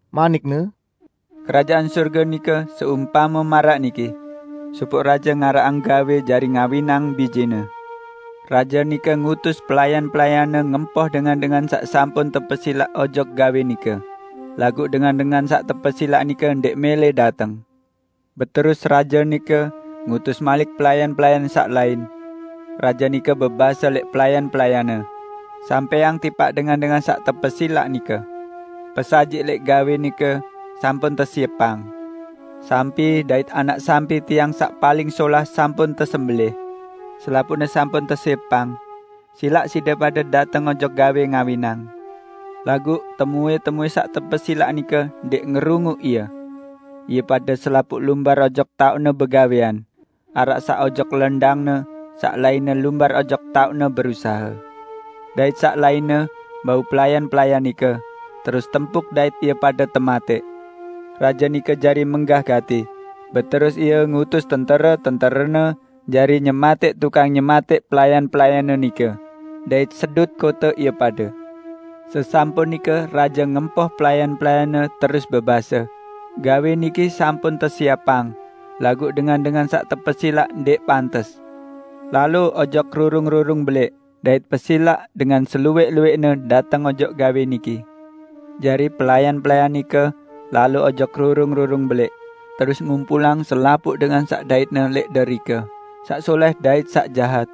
manik-Ne, "Kerajaan Sorge nike seumpame maraq niki: Sopoq raje ngaraqang gawẽ jari ngawinang bijene. Raje nike ngutus pelayan-pelayanne ngempoh dengan-dengan saq sampun tepesilaq ojok gawẽ nike, laguq dengan-dengan saq tepesilaq nike ndẽq mẽlẽ dateng. Beterus raje nike ngutus malik pelayan-pelayan saq lain. Raje nike bebase lẽq pelayan-pelayanne, 'Sampẽang tipaq dengan-dengan saq tepesilaq nike: Pesajiq lẽq gawẽ nike sampun tesiepang. Sampi dait anak sampi tiang saq paling solah sampun tesembelẽh. Selapuqne sampun tesiepang. Silaq side pade dateng ojok gawẽ ngawinang!' Laguq temuẽ-temuẽ saq tepesilaq nike ndẽq ngerunguq ie. Ie pade selapuq lumbar ojok taoqne begawẽan -- araq saq ojok lendangne, saq lainne lumbar ojok taoqne berusahe; dait saq lainne bau pelayan-pelayan nike, terus tempuk dait ie pade tematẽq. Raje nike jari menggah gati. Beterus ie ngutus tentere-tenterene jari nyematẽq tukang nyematẽq pelayan-pelayanne nike, dait sedut kote ie pade. Sesampun nike raje ngempoh pelayan-pelayanne, terus bebase, 'Gawẽ niki sampun tesiepang laguq dengan-dengan saq tepesilaq ndẽq pantes. Lalo ojok rurung-rurung belẽq, dait pesilaq dengan seluwẽq-luwẽqne dateng ojok gawẽ niki.' Jari pelayan-pelayan nike lalo ojok rurung-rurung belẽq, terus ngumpulang selapuq dengan saq daitne lẽq derike, saq solẽh dait saq jahat.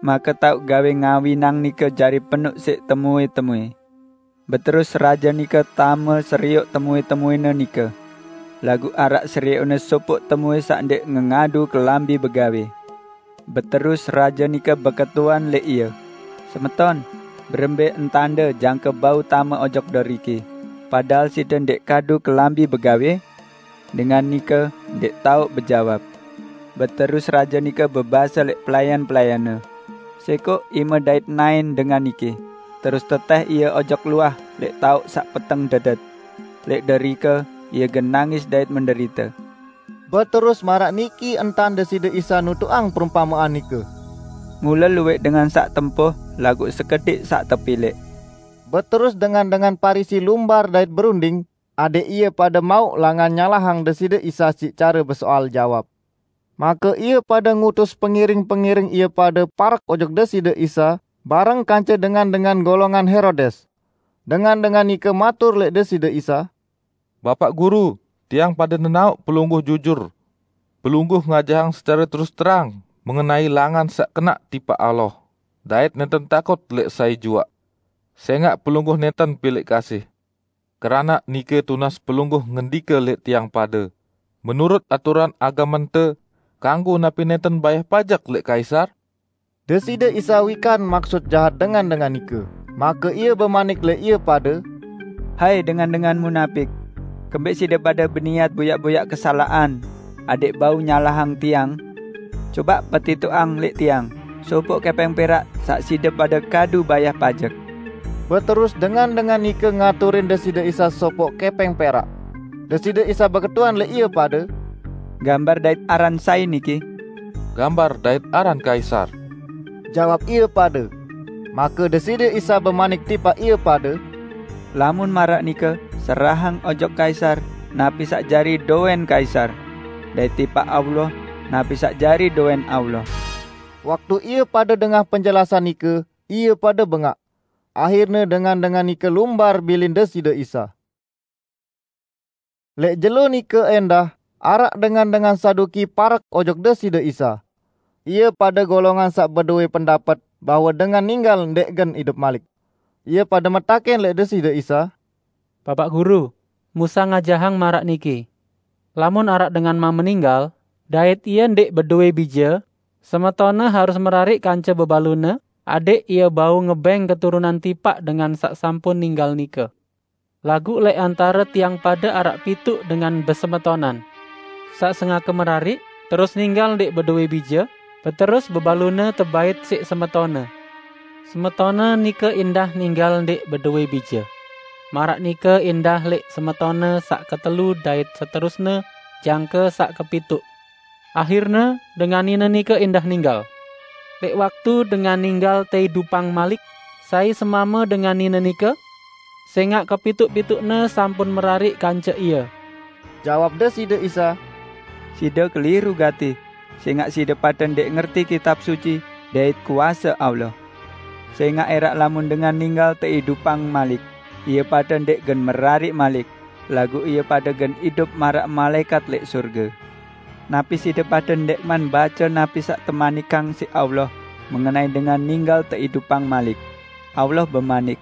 Make taoq gawẽ ngawinang nike jari penoq siq temuẽ-temuẽ. Beterus raje nike tame serioq temuẽ-temuẽne nike. Laguq araq serioqne sopoq temuẽ saq ndẽq ngengadu kelambi begawẽ. Beterus raje nike beketuan lẽq ie, 'Semeton, berembẽ entande jangke bau tame ojok deriki, padahal side ndẽq kadu kelambi begawẽ?' Dengan nike ndẽq tao bejawab. Beterus raje nike bebase lẽq pelayan-pelayanne, 'Sẽkoq ime dait naẽn dengan niki, terus tetẽh ie ojok luah lẽq taoq saq peteng dedet. Lẽq derike ie gen nangis dait menderite.' " Beterus maraq niki entan Deside Isa nutuqang perumpamean nike, "Mule luwẽq dengan saq tempoh laguq sekediq saq tepilẽq." Beterus dengan-dengan Parisi lumbar dait berunding adẽq ie pade mauq langan nyalahang Deside Isa siq care besoal jawab. Make ie pade ngutus pengiring-pengiring ie pade parek ojok Deside Isa bareng kance dengan-dengan golongan Herodes. Dengan-dengan nike matur lẽq Deside Isa, "Bapaq Guru, tiang pade nenaoq Pelungguh jujur. Pelungguh ngajahang secare terus terang mengenai langan saq kenaq tipaq Allah, dait nẽnten takut lẽq sai juaq. Sẽngaq Pelungguh nẽnten pilẽq kasih. Keranaq nike tunas Pelungguh ngendike lẽq tiang pade: Menurut aturan agamente, kanggo napi nẽnten bayah pajek lẽq Kaisar?" Deside Isa wikan maksut jahat dengan-dengan nike, make Ie bemanik lẽq ie pade, "Hai, dengan-dengan munapik! Kembẽq side pade beniat boyaq-boyaq kesalaqan adẽq bau nyalahang Tiang? Cobaq petitoqang lẽq Tiang sopoq kẽpẽng perak saq side pade kadu bayah pajek!" Beterus dengan-dengan nike ngaturin Deside Isa sopoq kẽpẽng perak. Deside Isa beketuan lẽq ie pade, "Gambar dait aran sai niki?" "Gambar dait aran Kaisar," jawab ie pade. Make Deside Isa bemanik tipaq ie pade, "Lamun maraq nike serahang ojok Kaisar napi saq jari dowẽn Kaisar, dait tipaq Allah napi saq jari dowẽn Allah." Waktu ie pade dengah penjelasan nike ie pade bengaq. Ahirne dengan-dengan nike lumbar bilin Deside Isa. Lẽq jelo nike ẽndah, araq dengan-dengan Saduki parek ojok Deside Isa. Ie pade golongan saq bedowẽ pendapet bahwe dengan ninggal ndẽq gen idup malik. Ie pade metakẽn lẽq Deside Isa, "Bapaq Guru, Musa ngajahang maraq niki: Lamun araq dengan mame ninggal, dait ie ndẽq bedowẽ bije, semetonne harus merariq kance bebalune adẽq ie bau ngebẽng keturunan tipaq dengan saq sampun ninggal nike. Laguq lẽq antare tiang pade araq pituq dengan besemetonan. Saq sengake merariq, terus ninggal ndẽq bedowẽ bije, beterus bebalune tebait siq semetonne. Semetonne nike ẽndah ninggal ndẽq bedowẽ bije. Maraq nike ẽndah lẽq semetonne saq ketelu dait seterusne jangke saq kepituq. Ahirne dengan nine nike ẽndah ninggal. Lẽq waktu dengan ninggal teidupang malik, sai semame dengan nine nike? Sẽngaq kepituq-pituqne sampun merariq kance ie." Jawab Deside Isa, "Side keliru gati, sẽngaq side pade ndẽq ngerti Kitab Suci dait kuase Allah. Sẽngaq ẽraq lamun dengan ninggal teidupang malik, ie pade ndẽq gen merariq malik, laguq ie pade gen idup maraq malaẽkat lẽq sorge. Napi side pade ndẽqman bace napi saq temanikang siq Allah mengenai dengan ninggal teidupang malik? Allah bemanik,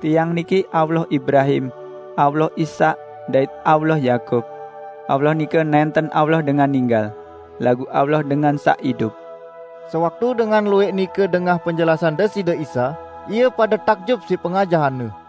'Tiang niki Allah Ibrahim, Allah Ishak dait Allah Yakub.' Allah nike nẽnten Allah dengan ninggal, laguq Allah dengan saq idup!" Sewaktu dengan luwẽq nike dengah penjelasan Deside Isa, ie pade takjub siq pengajahan-Ne.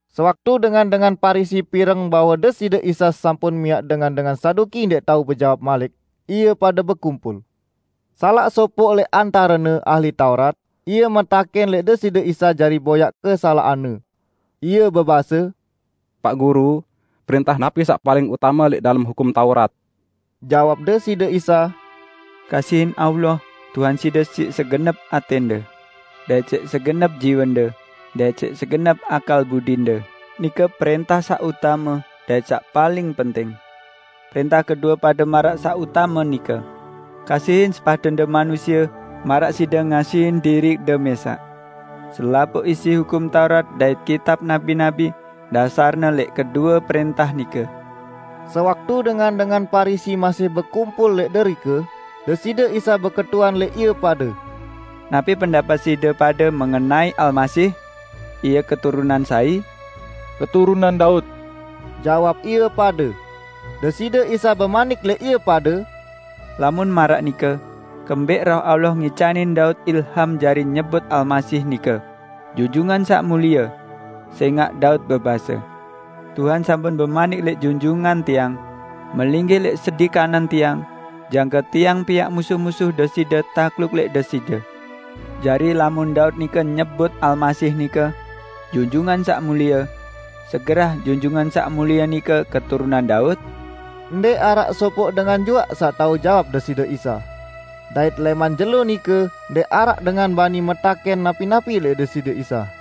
Sewaktu dengan-dengan Parisi pireng bahwe Deside Isa sampun miaq dengan-dengan Saduki ndẽq tao bejawab malik, ie pade bekumpul. Salaq sopoq lẽq antarene, ahli Taurat, ie metakẽn lẽq Deside Isa jari boyaq kesalaqan-Ne: Ie bebase, "Paq Guru, prẽntah napi saq paling utame lẽq dalem Hukum Taurat?" Jawab Deside Isa, "Kasihin Tuhan Allahde siq segenep atẽnde, dait siq segenep jiwende, dait siq segenep akal budinde. Nike prẽntah saq utame dait saq paling penting! Prẽntah kedue pade maraq saq utame nike: Kasihin sepadende manusie, maraq side ngasihin diriqde mẽsaq. Selapuq isi Hukum Taurat dait kitab nabi-nabi dasarne lẽq kedue prẽntah nike." Sewaktu dengan-dengan Parisi masih bekumpul lẽq derike, Deside Isa beketuan lẽq ie pade, "Napi pendapet side pade mengenai Almasih? Ie keturunan sai?" "Keturunan Daud," jawab ie pade. Deside Isa bemanik lẽq ie pade, "Lamun maraq nike, kembẽq Roh Allah ngicanin Daud ilham jari nyebut Almasih nike 'Junjungan Saq Mulie'? Sẽngaq Daud bebase, 'Tuhan sampun bemanik lẽq Junjungan tiang: Melinggih lẽq sedi kanan Tiang, jangke Tiang piaq musuh-musuh Deside takluk lẽq Deside.' Jari lamun Daud nike nyebut Almasih nike, 'Junjungan Saq Mulie', segerah Junjungan Saq Mulie nike keturunan Daud?" Ndẽq araq sopoq dengan juaq saq tao jawab Deside Isa. Dait lẽman jelo nike ndẽq araq dengan bani metakẽn napi-napi lẽq Deside Isa.